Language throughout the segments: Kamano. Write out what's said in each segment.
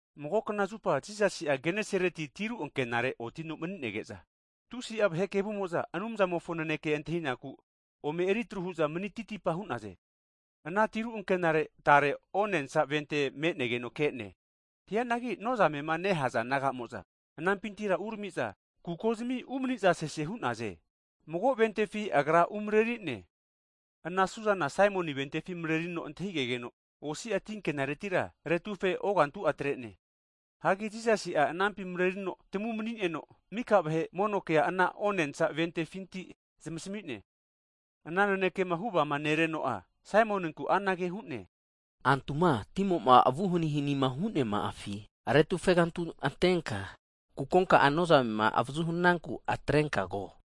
Mago knazupa Jisasi'a Genesareti tiru ankenare otino mani'nege'za, tusi'a vahe kevumo'za Anumzamofo naneke antahinaku ome eritruhu'za manititipa hu'naze. Ana tiru ankenare tare onensa vente me'negeno ke'ne. Hianagi nozamema nehaza naga'mo'za anampintira urami'za, kukozimi umaniza sese hu'naze. Mago votifi Agra umarerine, ana suzana Saimoni votifi marerino antahigegeno tinkenaretira osi'a aretufe ogantu'a atre'ne. Hagi Jisasi'a anampi marerino tamu mani'neno, mika vahe mono kea ana onensa ventefinti zamasmi'ne. Ana nanekema huvama nereno'a Saimoninkura anage hu'ne, Antuma timo'ma avuhanihanima hu'neama'afi aretufe kantu antenka, kukonka'a nozamema avazu hananku atrenkago.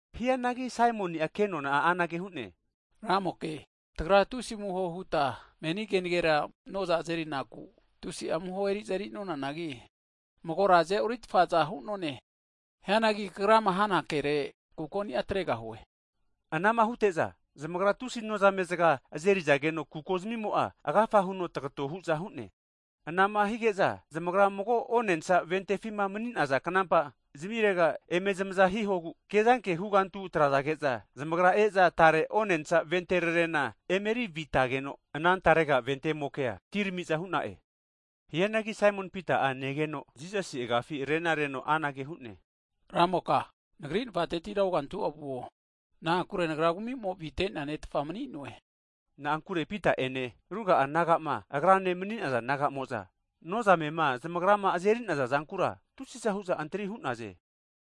Hianagi Saimoni'a kenona'a anage hu'ne, Ramoke, tagra tusi amuho huta meni keragera noza azeri naku tusi'a amuho eri'za erinonanagi, magora aze'oritfaza hu'none. Hianagi Kagrama hana kere kukoni'a ataregahue. Anama hute'za zamagra tusi nozamezaga azerizageno kukozamimoa agafa huno tagato hu'za hu'ne. Anama hige'za, zamagra mago votifi mani'naza knampa zamirega eme zamaza hihogu kezanke hugantu atrage'za zamagra e'za tarega votirarena emeri avitageno, anantarega votiraremokea tirami'za hu'na'e. Hianagi Saimon Pita'a ana zama negeno'a, Jisasi agafi renareno anage hu'ne, Ramoka nagri navatetira ogantua vuo. Na'ankure nagra kumimo avite'nea ne'tfa mani'noe! Na'ankure Pita'ene, ruga'a nagama agrane mani'naza naga'mo'za nozamema zamagrama azeri'naza zankura, tusi'za hu'za antri hu'naze.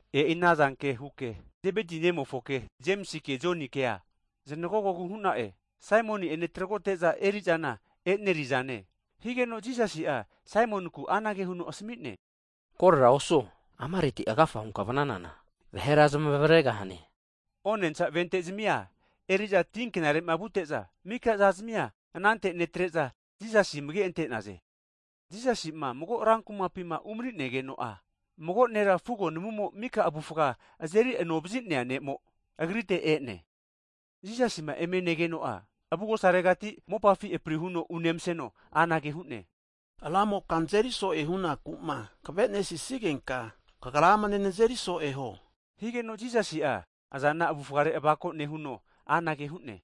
E'i anazanke huke Zebeti ne'mofo Jemisike, Jonikea znagogogu hu'na'e, Saimoni ene tragote'za erizana e'nerizane. Higeno Jisasi'a Saimoninku anage huno asami'ne, Korera osuo, amaretima agafa hunka vnanana, vahera zamavaregahane. Onensa vente'zamia eri'za tinkenare'ma vute'za, mika zazmia anante netre'za, Jisasi amage ante'naze. Jisasi'ma mago rankumapima umani'negeno'a, mago nera fugo namumo miko avufga azeri anovazi'nea ne'mo, Agrite e'ne. Jisasima eme negeno'a, avugosaregati mopafi prihuno unemaseno anage hu'ne, Ramoka nazeri so'e hunaku'ma kavemasisigenka, kagra amane nazeri so'e huo. Higeno Jisasi'a azana avufare avako nehuno anage hu'ne,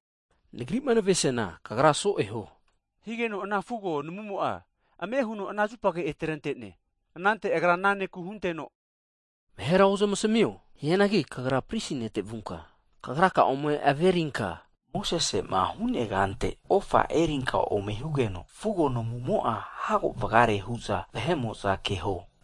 Nagri'ma navesiana, kagra so'e huo higeno, ana fugo namumo'a ame huno ana zupage atrente'ne. Anante Agra ana nera asamino, Vahera ozamasmio. Hianagi kagra Pristi nete vunka, kagraka'a ome averinka Mosesima huneagante, ofa erinka ome hugeno, fugo namumo'a hago vagare hu'za vahe'mo'za kageho.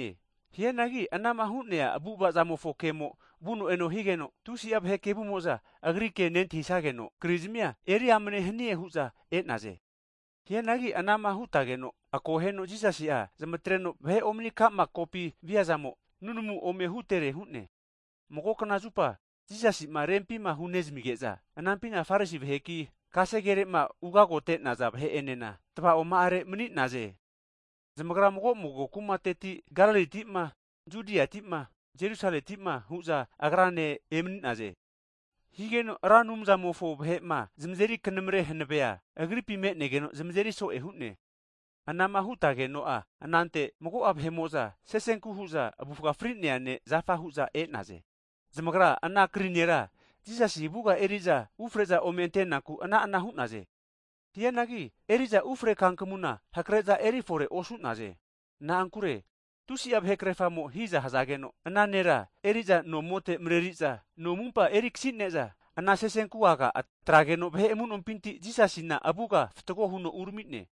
Hianagi anama hu'nea avu'avazamofo kemo vuno eno higeno, tusi'a vahe kevumo'za Agri ke nentahisageno, krizmia eriamane hanie hu'za e'naze. Hianagi anama hutageno'a, Jisasi'a zamatreno vahe omani ka'ma kopi viazamo nunamu ome hutere hu'ne. Mago knazupa Jisasima rempima hu'nezamige'za anampina Farisi vaheki, kasegerema ugagote'naza vahe'enena tavaoma'are mani'naze. (Zamagara mago mago ana kumatamina Galilitima, Judiati'ma, Jerusaletima hu'za Agrane emani'naze.) Higeno Ra Anumzamofo vahe'ma zamazeri knamare hanavea, Agripi me'negeno zamazeri so'e hu'ne. Anama hutegeno'a anante mago'a vahe'mo'za sesenku hu'za avufa fri'nea nera zafa hu'za e'naze. Zamagara ana krima eri'nea nera Jisasi avuga eri'za ufre'za ome antenaku ana'ana hu'naze. Hianagi eri'za ufre kankamuna hakare'za erifore osu'naze. Na'ankure tusi'a vahekrerfamo'za hiza hazage'za, ana nera avre'za nomote mareri'za, no amumpa eri akasine'za ana sesenku'aga atrageno vahe amu'nompinti Jisasina avuga fatgo huno urami'ne.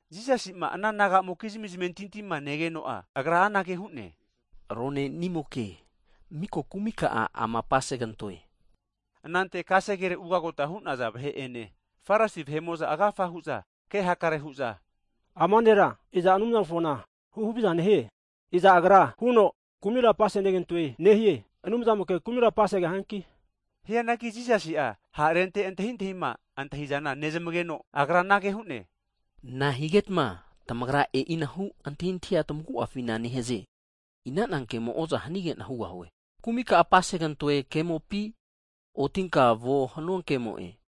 Jisasi'ma ana nagamokizmi zamentintima negeno'a, Agra anage hu'ne, Ronenimoke, miko kumika'a ama apase kantoe. Anante kasegere ugagota hunaza vahe'ene, Farisi vahe'mo'za agafa hu'za ke hakare hu'za, ama nera iza Anumzamofona huhaviza nehie? Iza Agra huno kumira apasenegantoe nehie. Anumzamoke kumira apasegahianki? Hianagi Jisasi'a ha'arente antahintahima antahi'zana nezmageno, Agra anage hu'ne, Nahigetma tamagra e'inahu antahintahia tamagu'afina nentahize? Inana kemo oza hanigena hugahue, Kumika'a apasegantoe kemopi, Otinka vuo hanua kemo'e?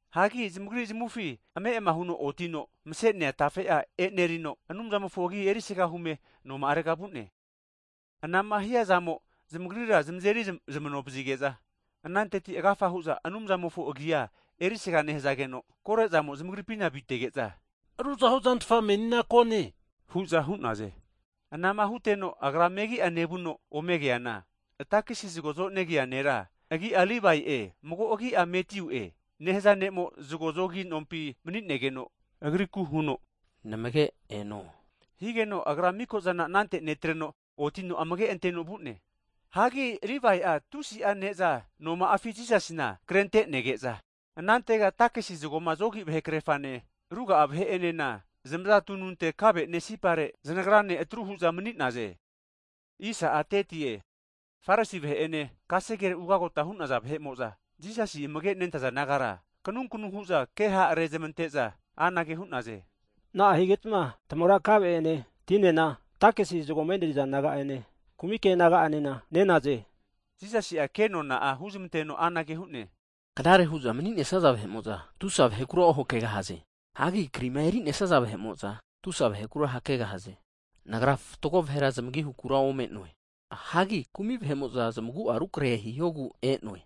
Hagi zamagri zamufi ame' huno otino, mase'nea tafe'a enerino Anumzamofo agi erisaga hume noma'arega vu'ne. Anama hiazamo zamagrira zamazeri zamanovazige'za, ananteti agafa hu'za Anumzamofo agia erisga nehazageno, kore'zamo zamagripina avitege'za, ruzahu zantafa menina kone, hu'za hu'naze. Anama huteno Agra megi'a nevuno omegeana, takisi zago zonegia nera agi'a Livae'e mago'a agi'a Matiu'e nehaza ne'mo zago zogi nompi mani'negeno ome negeno anage agriku huno, Namage eno. Higeno agra miko'zana anante netreno, otino amage'anteno vu'ne. Hagi Livae'a tusi'a ne'za noma'afi Jisasina krentenege'za, anantega takisi zagoma zogi vahe krerafane, ruga'a vahe'enena zamaza tununte kave'ne sipare zanagrane atru hu'za mani'neza ne'zana ne'naze. Farisi vahe'ene, kasegere ugagota hu'naza vahe'mo'za, Jisasi amage nentaza disaipol nagara kanunkanu hu'za ke ha' rezmante'za anage hu'naze, na'ahigetma tamagra kave ene, tinena takisi zagoma eneriza naga'ene, kumike naga'enena nenaze? Jisasi'a kenona huzamanteno anage hu'ne, Knare huza mani'nesaza vahe'mo'za tusa vahekura ohakegahaze. Hagi krima erinesaza vahe'mo'za tusa vahekura hakegahaze. Nagra fatgo vahera zamagi hukura ome'noe, hagi kumi vahe'mo'za zamagu'a rukrehe hihogu e'noe.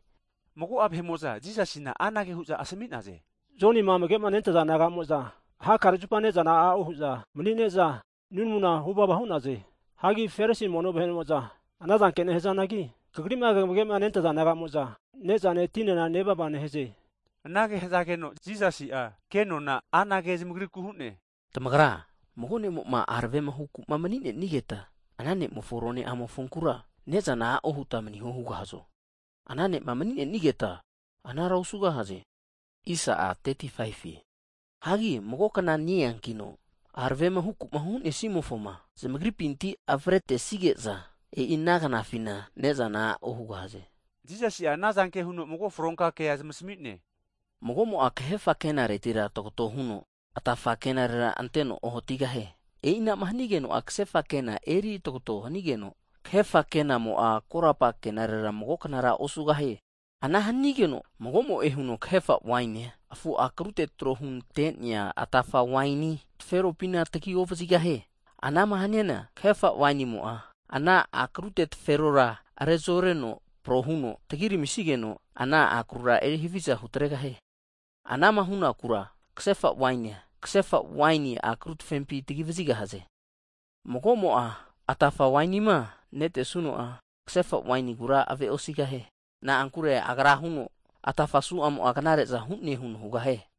Mago'a vahe'mo'za Jisasina amanage hu'za asmi'naze, Jonima amage'ma nentaza disaipol naga'mo'za, hakare zupa ne'zana a'o hu'za mani'ne'za nunamu huvava hu'naze. Hagi Farisi mono vahe'mokizmi disaipol vahe'mo'za anazanke nehazanagi, kagrima kamage'ma nentaza naga'mo'za nezane, tinena nevava nehaze. Anage hazageno Jisasi'a kenona anage huno zamagrikura hu'ne, Tamagra mago ne'mo'ma aravema huku'ma mani'nenigeta, ana ne'mofo ru ne' a'mofonkura, ne'zana a'o huta maniho hugahazo? Ana ne'ma mani'nenigeta anara osugahaze. Hianagi mago kna ne-eankino, aravema huku'ma hunesimofoma zamagripinti avretesigeza, e'i ana knafina ne'zana a'o hugahaze. Jisasi'a anazanke huno mago fronka kea zamasmi'ne. Mago'mo'a kahefa kenaretira tagato huno atafa kenarera anteno ohatigahie. E'inama hanigeno'a, kasefa kena eri tagato hanigeno, kasefa kenamo'a korapa kenarera mago knara osugahie. Ana hanigeno magomo'e huno kahefa wainia, meme afu akruteti tro hunte'nea atafa waini taferopina tagi ovazigahie. Anama haniana, kahefa wainimo'a ana akru taferora rezoreno prohuno tagiramisigeno, ana akarura erihaviza hutregahie. Anama hunakura, kasefa wainia, kasefa waini akru tafempi tagi vazigahaze. Mago'mo'a atafa wainima netesuno'a, kasefa wainigura aveosigahie. Na'ankure Agra huno, atafa suamo'a knare'za hu'ne huno hugahie.